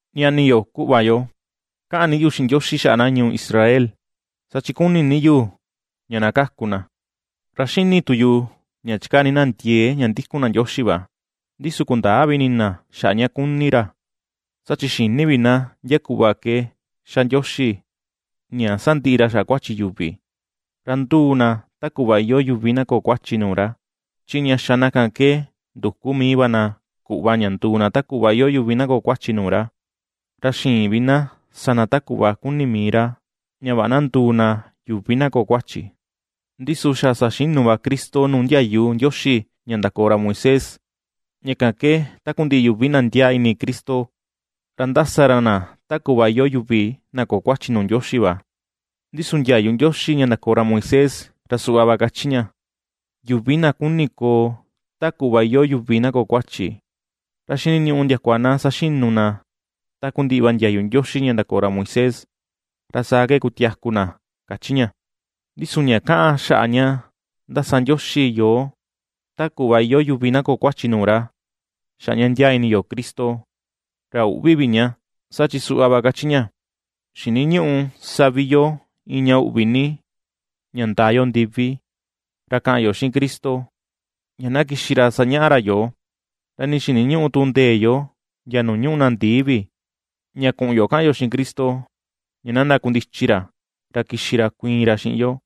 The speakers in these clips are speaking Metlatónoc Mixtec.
Ñani yo, kuꞌva yo, kaꞌan ni yu xiꞌin Ndioxi xaꞌa na ñuu Israel, saa chi ^kuni ni yu ña na kaku na. Ra xíni̱ tu yu, ña chikaa ni na ndiee ña ndikun na Ndioxi va, ndi su kundäa vi ini na xaꞌa ña kuni ra. Saa chi xïni vi na ndia kuꞌva ke ^xa Ndioxi ña sandiꞌi ra xaꞌa kuachi yuvi, ra nduu na ta kuꞌva iyoo yuvi na köo kuachi nuu ra, chi ña xa na ke nduku mii va na kuꞌva ña nduu na ta kuꞌva iyoo yuvi na köo kuachi nuu ra, ra ^xïin vi na sa na ta kuꞌva kuni mii ra ña vaꞌa na nduu na yuvi na köo kuachi. Ndi su xa saxinu va Cristo nuu ndiayu Ndioxi ña ndakoo ra Moisés, ña kan ke takundiꞌi yuvi na ndiaa ini Cristo, ra ^ndasa ra na ta kuꞌva iyoo yuvi na köo kuachi nuu Ndioxi va. Ndi su ndiayu Ndioxi ña ndakoo ra Moisés, ra suꞌva va kachi ña: “Yuvi na ^kuni koo ta kuꞌva iyoo yuvi na köo kuachi, ra xiniñuꞌu ndiakua na saxinu na takundiꞌi va ndiayu Ndioxi ña ndakoo ra Moisés, ra saa ke kutiaku na”, kachi ña. Ndi su ña kaꞌan xaꞌa ña ^ndasa Ndioxi yoo, ta kuꞌva iyoo yuvi na köo kuachi nuu ra xaꞌa ña ndiaa ini yo Cristo, ra üꞌvi vi ña, saa chi suꞌva va kachi ña: “Xiniñüꞌu sa vi yo iin ña uꞌvi ni ña ndaa yo ndivi, ra kaꞌan yo xiꞌin Cristo, ña na kixi ra sañaꞌa ra yoo, ra nii xiniñüꞌu tu ndee yo ndia nuu ñuꞌu na ndii vi, ña kuꞌun yo kaꞌan yo xiꞌin Cristo ña na ndakundichi ra, ra kixi ra kuiin ra xiꞌin yo.”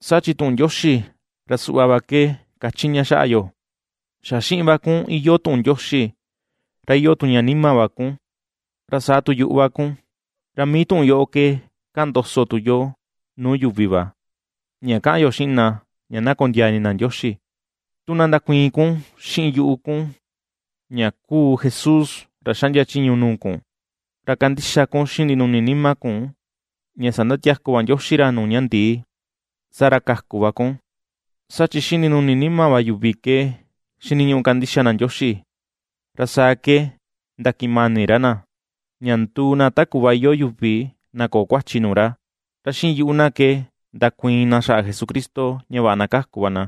Saa chi tuꞌun Ndioxi, ra suꞌva va ke kachi ña xaꞌa yo: “Xa xiꞌin va kun iyoo tuꞌun Ndioxi, ra iyoo tu ña nima va kun, ra saa tu yuꞌu va kun.” Ra mii tuꞌun yoꞌo ke kaꞌan ndoso tu yo nuu yuvi va, ña kaꞌan yo xiꞌin na ña na kondiaa ini na Ndioxi. Tu na ndakuiin kun xiꞌin yuꞌu kun ña kuu Jesús ra xaꞌndia chiñu nuu kun, ra kandixa kun xiꞌin ndinuni nima kun ña sandatiaku va Ndioxi ra nuu ña ndii, saa ra kaku va kun. Saa chi xiꞌin ndinuni nima va yuvi ke xiniñuꞌu kandixa na Ndioxi, ra saa ke ndakiꞌin mani ra na, ña nduu na ta kuꞌva iyoo yuvi na köo kuachi nuu ra; ra xiꞌin yuꞌu na ke ndakuiin na xaꞌa Jesucristo ña vaꞌa na kaku va na.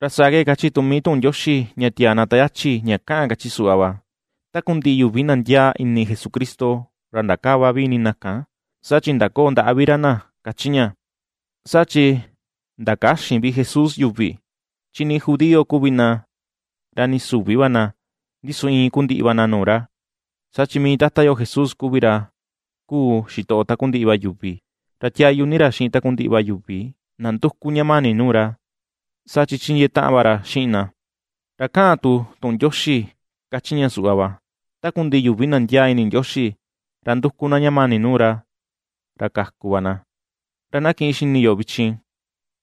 Ra saa ke kachi tu mii tuꞌun Ndioxi ña tiaa na ta yachi ña kaꞌan, kachi suꞌva va: “Takundiꞌi yuvi na ndiaa ini Jesucristo, ra ndakäva vi ini na kan, saa chi ndaköo ndaꞌa vi ra na”, ^kachi ña. Saa chi ndakäxin vi Jesús yuvi, chi nii judío kuvi na, ra nii süvi va na, ndi su iin kuu ndiꞌi va na nuu ra, saa chi mii Tata yo Jesús kuvi ra kuu xitoꞌo takundiꞌi va yuvi, ra tiáyú ni ra xiꞌin takundiꞌi va yuvi na nduku ña mani nuu ra, saa chi chindiee taꞌan va ra xiꞌin na. Ra kaꞌan tu tuꞌun Ndioxi kachi ña suꞌva va: “Takundiꞌi yuvi na ndiaa ini Ndioxi, ra nduku na ña mani nuu ra, ra kaku va na.” Ra na kiꞌin xini yo vichin,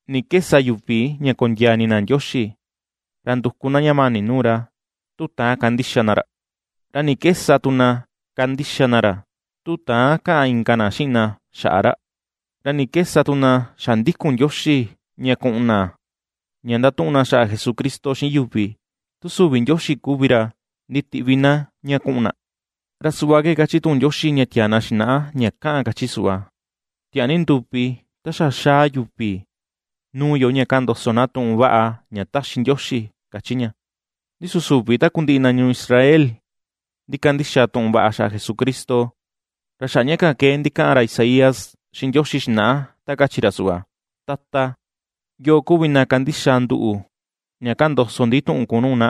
¿ni ke sa yuvi ña kondiaa ini na Ndioxi, ra nduku na ña mani nuu ra, tu täan kandixa na ra? ¿Ra ni ke sa tu na kandixa na ra, tu täan kaꞌan inka na xiꞌin na xaꞌa ra? ¿Ra ni ke sa tu na xa ndikun Ndioxi ña kuꞌun na ña ndatuꞌun na xaꞌa Jesucristo xiꞌin yuvi, tu süvi Ndioxi kuvi ra nditiꞌvi na ña kuꞌun na? Ra suꞌva ke kachi tuꞌun Ndioxi ña tiaa na xinaꞌa ña kaꞌan, kachi suꞌva: “¡Tiaa ni nduvi, ta xa ^xaa yuvi nuu yo ña kaꞌan ndoso na tuꞌun vaꞌa ña ^taxi Ndioxi!”, ^kachi ña. Ndi su süvi takundiꞌi na ñuu Israel ndikandixa tuꞌun vaꞌa xaꞌa Jesucristo. Ra xaꞌa ña kan ke ndikaꞌan ra Isaías xiꞌin Ndioxi xinaꞌa, ta kachi ra suꞌva: “Tata, ¿yoo kuvi na ^kandixa nduꞌu ña kaꞌan ndoso ndi tuꞌun kun nuu na?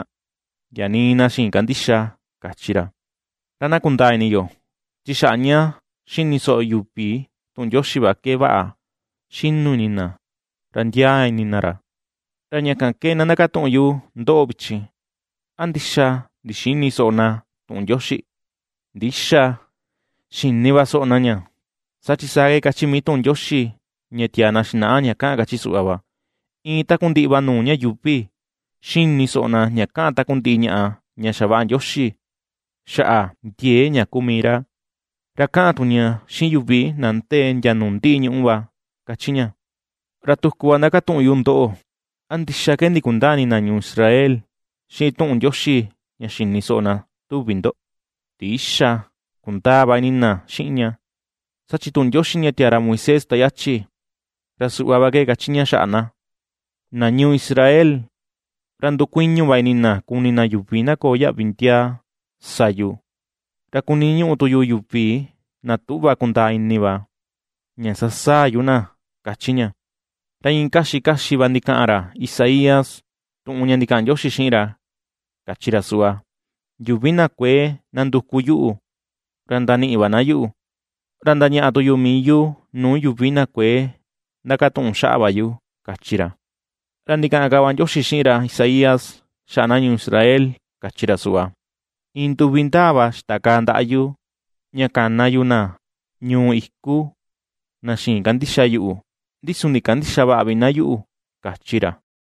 Ndia nii na xïin kandixa”, kachi ra. Ra na kundaa ini yo, chi xaꞌa ña ^xini soꞌo yuvi tuꞌun Ndioxi va ke, vaꞌa ^xinu ini na, ra ^ndiaa ini na ra. Ra ña kan ke na ndakatuꞌun yu ndoꞌo, vichin: ¿A ndixa ndixïni soꞌo na tuꞌun Ndioxi? ¡Ndïxa! ¡Xini va soꞌo na ña! Saa chi saa ke kachi mii tuꞌun Ndioxi ña tiaa na xinaꞌa ña kaꞌan, kachi suꞌva va: Iin takundiꞌi va nuu ña yuuvi, ^xini soꞌo na ña kaꞌan takundiꞌi ñaꞌa ña xavaꞌa Ndioxi xaꞌa ndiee ña kuu mii ra, ra kaꞌan tu ña, xiꞌin yuvi na ndee ndia nuu ndiꞌi nuu ñuꞌu va, ^kachi ña. Ra tuku va ndakatuꞌun yu ndoꞌo: ¿A ndixa ke ndikundäa ini na ñuu Israel xiꞌin tuꞌun Ndioxi ña xini soꞌo na, tuvi ndo? ¡Ndïxa! Kundaa va ini na xiꞌin ña. Saa chi tuꞌun Ndioxi ña tiaa ra Moisés ta yachi, ra suꞌva va ke kachi ña xaꞌa na: Na ñuu Israel, ra ndukuiñu va ini na kuni na yuvi na köo yaꞌvi ndiaa, sa yu; Ra kuniñuꞌu tu yu yuvi na tüꞌva kundaa ini va, ña sasaa yu na, ^kachi ña. Ra iin kaxi kaxi va ndikaꞌan ra Isaías, tuꞌun ña ndikaꞌan Ndioxi xiꞌin ra, kachi ra suꞌva: Yuvi na kuëe ^nanduku yuꞌu ra ndaniꞌi va na yuꞌu; Ra ndañaꞌa tu yu mii yu, nuu yuvi na kuëe ndakatuꞌun xaꞌa va yu, kachi ra. Ra ndikaꞌan ka va Ndioxi xiꞌin ra Isaías, xaꞌa na ñuu Israel, kachi ra suꞌva: Iin nduvi ndaa va xitakaa ndaꞌa yu, ña kana yu na ñuu iku, na xïin kandixa yuꞌu, ndi su ndikandïxa vaꞌa vi na yuꞌu, kachi ra.